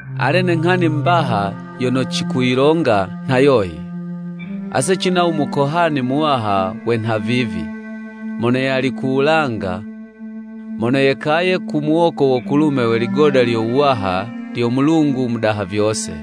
Ale ne nghani mbaha yono cikuyilonga nha yoyi: Ase cina u Mukohani Muwaha we nhavivi, mono yali ku wulanga mono yekaye ku muwoko wo kulume we ligoda lyo wuwaha lyo Mulungu u Mudaha vyose.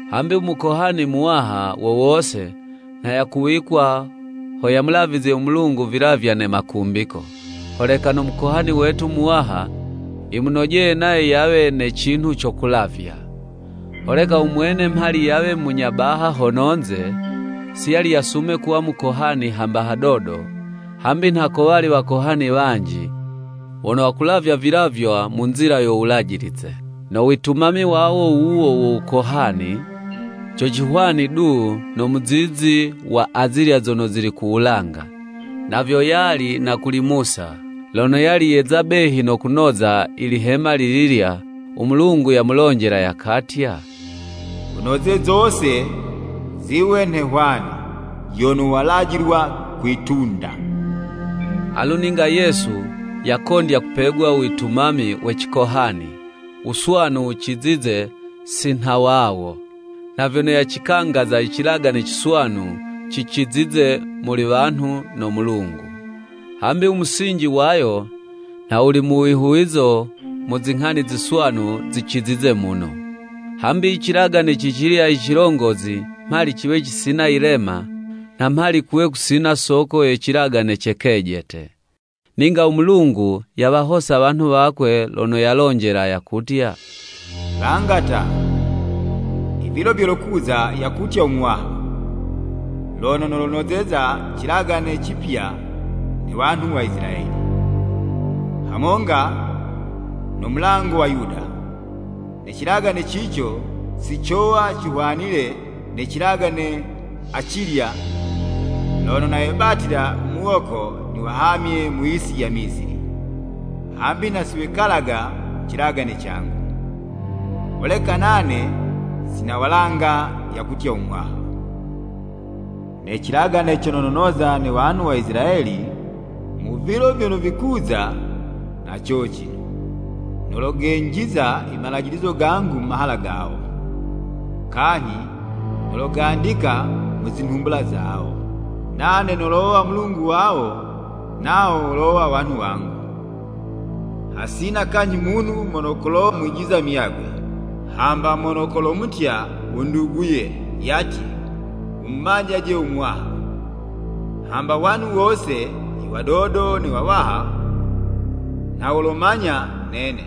Hambi u Mukohani Muwaha wo wose, nha yakuwikwa ho yamulavizye u Mulungu vilavya ne makumbiko, holeka no Mukohani wetu Muwaha yimunojeye nayo yawe ne cinhu co kulavya. Holeka u Mwene mhali yawe munya baha hono'nze, si yali yasume kuwa mukohani hamba hadodo, hambi nha kowali wakohani wanji, wono wakulavya vilavywa mu nzila yo Wulajilize. No witumami wawo wuwo wo wukohani, co cihwani du no muzizi wa azilya zono zili ku wulanga. Na vyo yali na kuli Musa. Lono yali yeza behi no kunoza i lihema lililya, u Mulungu yamulonjela yakatya, “Wunoze zose ziwe nhe hwani yono walajilwa kwi'tunda.” Alu ninga Yesu, yakondya kupegwa u witumami we cikohani, wuswanu wucizize si nha wawo, nha vyono yacikangaza i cilagane ciswanu cicizize muli wanhu no Mulungu, hambi u musinji wayo nha wuli mu wihuwizo mu zinghani ziswanu zicizize muno. Hambi i cilagane cicilya i cilongozi mhali ciwe cisina yilema, nha mhali kuwe kusina soko ye cilagane ce kejete. Ninga u Mulungu yawahosa wanhu wakwe lono yalonjela yakutya: “Langa ta, i vilo vyolokuza yakutya u Muwaha, lono nolonozeza i cilagane cipya ne wanhu wa Isilayeli, hamonga na womulango wa Yuda. Ne cilagane cico si cowa cihwanile ne cilagane acilya lono nawebatila muwoko niwahamye mu yisi ya Misili. Hambi nha si wekalaga mu cilagane cangu. Holeka nane sinawalanga, yakutya u Muwaha. Ne cilagane cono nonoza ne wanhu wa Isilayeli mu vilo vyono vikuza nha cocino, nologenjiza i malajilizo gangu mu mahala gawo, kanyhi nologandika mu zinhumbula zawo. Nane nolowa Mulungu wawo nawo wolowa wanhu wangu. Hasina kanyhi munhu mono kolomwijiza u muyagwe. Hamba mono kolomutya u nduguye yatye, ‘Wumumanyaje u Muwaha.’ Hambi wanhu wose i wadodo ne wawaha nha wolomanya nene.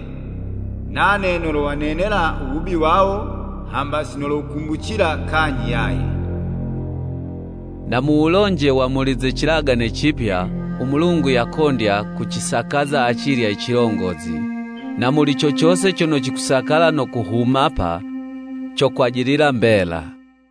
Nane nolowanenela u wubi wawo hamba si nowukumbucila kanyhi yaye.” Na muwulonje wa muli ze cilagane cipya, u Mulungu yakondya kucisakaza acilya i cilongozi, na muli co cose cono cikusakala no kuhumapa, cokwajilila mbela.